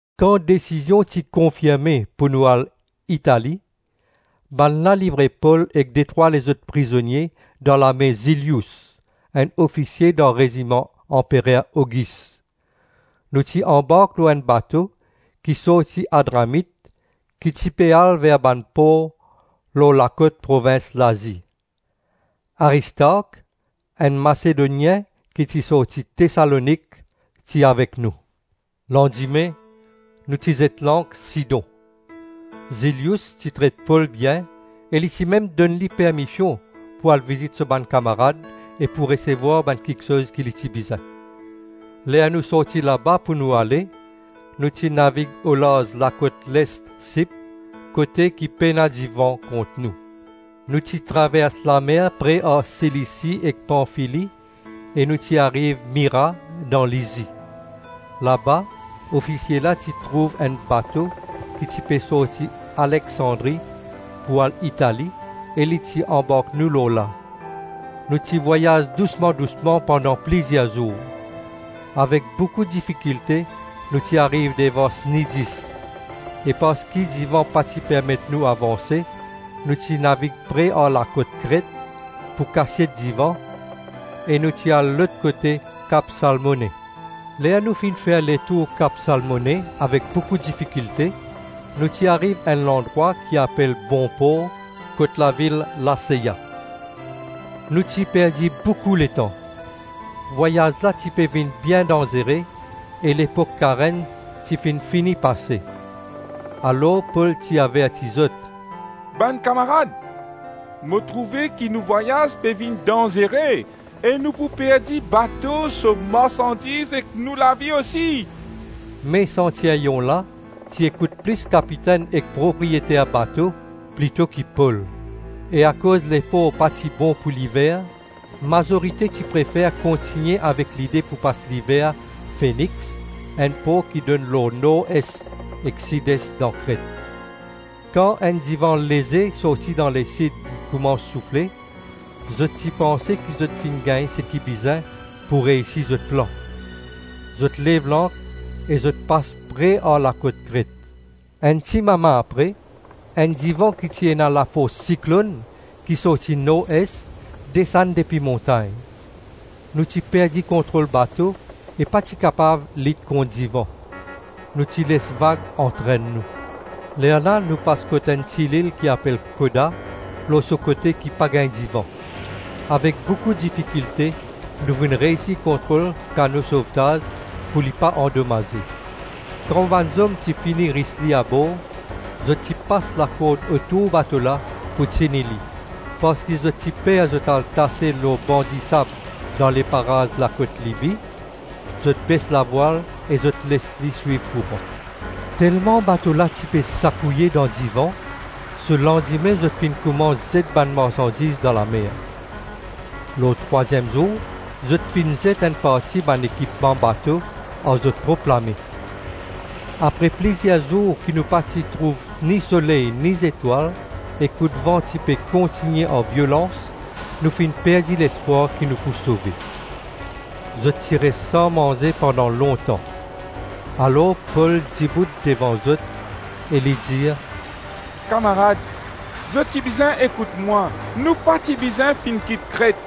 Kan desizion ti konfirme pou nou al Itali, bannla livre Pol ek detrwa lezot prizonie dan lame Zilious enn ofisie dan reziman Anperer Ogis. Nou ti anbark lor enn bato ki sorti Adramit ki ti pe al ver bann por lor lakot provins Lazi. Aristark, enn Masedonien ki ti sorti Tesalonik, ti avek nou. Landime nou ti zet lank Sidon. Zilious ti tret Pol bien e li ti mem donn li permision pou al vizit so bann kamarad e pou resevwar bann kiksoz ki li ti bizin. Ler nou sorti laba pou nou ale, nou ti navig olarz lakot lest Sip, kote ki pena divan kont nou. Nou ti travers lamer pre ar Silisi ek Panfili e nou ti ariv Mira dan Lisi. Laba ofisie la ti trouv enn bato ki ti pe sorti Aleksandri pou al Itali, e li ti anbark nou lor la. Nou ti vwayaz dousma-dousma pandan plizir zour. Avek boukou difikilte nou ti ariv devan Snidis e parski divan pa ti permet nou avanse, nou ti navig pre ar lakot Kret, pou kasiet divan, e nou ti al lot kote kap Salmone. Ler nou finn fer letour kap Salmone avek boukou difikilte, nou ti ariv enn landrwa ki apel Bon Por kot lavil Laseya. Nou ti perdi boukou letan. Vwayaz la ti pe vinn bien danzere e lepok karem ti finn fini pase. Alor Pol ti averti zot, “Bann kamarad, mo trouve ki nou vwayaz pe vinn danzere e nou pou perdi bato, so marsandiz ek nou lavi osi.” Me santiryon la ti ekout plis kapitenn ek propriyeter bato, plito ki Pol. E akoz lepor pa ti bon pou liver, mazorite ti prefer kontigne avek lide pou pas liver Fenix, enn por ki donn lor nor-es ek sid-es dan Kret. Kan enn divan leze sorti dan lesid koumans soufle, zot ti panse ki zot finn gagn seki bizin pou reysi zot plan. Zot lev lank e zot pas pre ar lakot Kret. Enn ti mama apre, enn divan ki ti ena lafors siklonn ki sorti nor-es, desann depi montagn. Nou ti perdi kontrol bato e pa ti kapav lit kont divan; nou ti les vag antrenn nou. Lerla nou pas kot enn ti lil ki apel Koda, lor so kote ki pa gagn divan; avek boukou difikilte nou finn reysi kontrol kano sovtaz pou li pa andomaze. Kan bann zom ti fini ris li abor zot ti pas lakord otour bato la pou tini li. Parski zot ti per zot al tase lor ban disab dan leparaz lakot Libi, zot bes lavwal e zot les li swiv kouran. Telman bato la ti pe sakouye dan divan, so landime zot finn koumans zet bann marsandiz dan lamer; lor trwaziem zour zot finn zet enn parti bann ekipman bato ar zot prop lame. Apre plizir zour ki nou pa ti trouv ni soley ni zetwal e koudvan ti pe kontigne ar violans, nou finn perdi lespwar ki nou pou sove. Zot ti res san manze pandan lontan. Alor Pol dibout devan zot e li dir, “Kamarad, zot ti bizin ekout mwa, nou pa ti bizin finn kit Kret;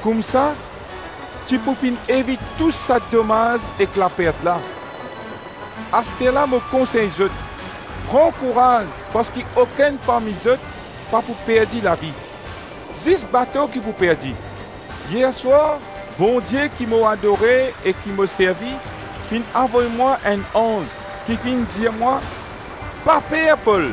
koumsa ti pou finn evit tou sa domaz ek lapert la. Asterla mo konsey zot pran kouraz parski okenn parmi zot pa pou perdi lavi; zis bato ki pou perdi. Yer swar, Bondie ki mo adore e ki mo servi, finn avoy mwa enn anz ki finn dir mwa, ‘Pa per, Pol;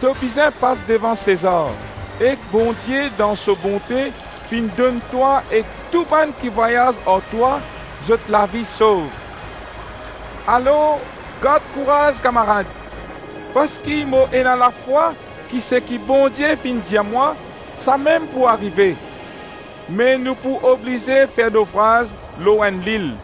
to bizin pas devan Sezar, ek Bondie dan so bonte finn donn twa ek tou bann ki vwayaz ar twa zot lavi sov.’ Alors gard kouraz, kamarad, parski mo ena lafwa ki seki Bondie finn dir mwa, samem pou arive. Me nou pou oblize fer nofraz lor enn lil.”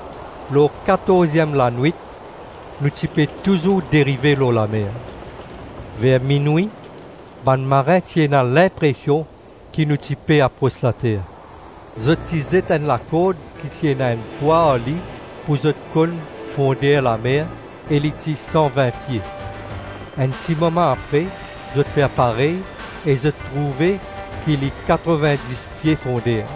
Lor katorziem lanwit nou ti pe touzour derive lor lamer. Ver minwi, bann marin ti ena linpresion ki nou ti pe apros later. Zot ti zet enn lakord ki ti ena enn pwa ar li pou konn fonder lamer e li ti san-vin pie. Enn timama apre zot fer parey e zot trouve ki li katrovin-dis pie fonder.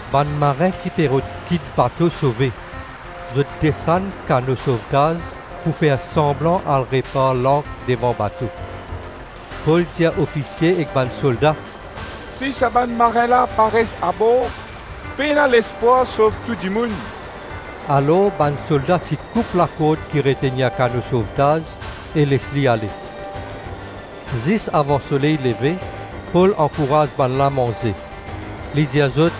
Bann marin ti pe rod kit bato, sove. Zot desann kano sovtaz pou fer sanblan al repar lank devan bato. Pol dir ofisie ek bann solda, “Si sa bann marin la pa res abor, pena lespwar sov tou dimoun.” Alors bann solda ti koup lakord ki retenir kano sovtaz e les li ale. Zis avan soley leve Pol ankouraz bannla manze. Li dir zot,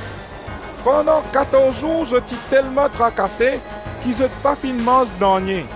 “Pandan katorz zour zot ti telman trakase ki zot pa finn manz nanye.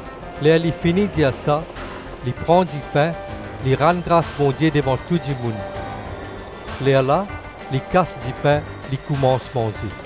Ler li fini dir sa, li pran dipin, li rann gras Bondie devan tou dimoun. Lerla li kas dipin, li koumans manze.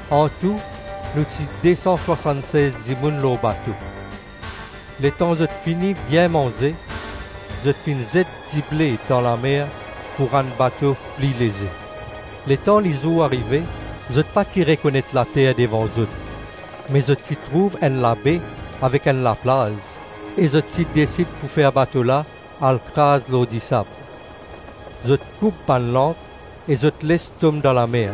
Antou nou ti de-san swasann-sez dimoun lor bato. Letan zot fini bien manze, zot finn zet dible dan lamer pou rann bato pli leze. Letan lizour arive, zot pa ti rekonet later devan zot, me zot ti trouv enn labe avek enn laplaz e zot ti desid pou fer bato la al kraz lor disab. Zot koup bann lank e les zot tom dan lamer,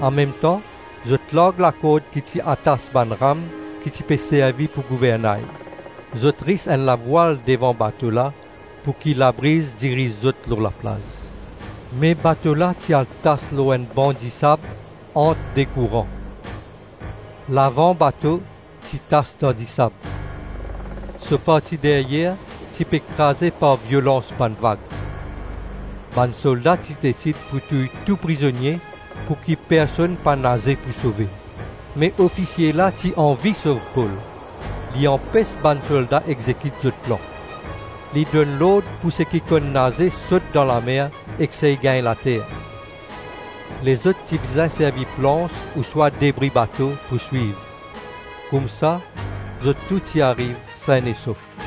anmemtan zot larg lakord ki ti atas bann ram ki ti pe servi pou gouvernay. Zot ris enn lavwal devan bato la pouki labriz diriz zot lor laplaz. Me bato la ti al tas lor enn ban disab ant de kouran. Lavan bato ti tas dan disab. So parti deryer ti pe kraze par violans bann vag. Bann solda ti desid pou touy tou prizonie pouki personn pa naze pou sove. Me ofisie la ti anvi sov Pol. Li anpes bann solda exekit zot plan. Li donn lord pou seki konn naze sot dan lamer ek sey gagn later. Lezot ti bizin servi plans ouswa debri bato pou swiv. Koumsa zot tou ti ariv sin e sof.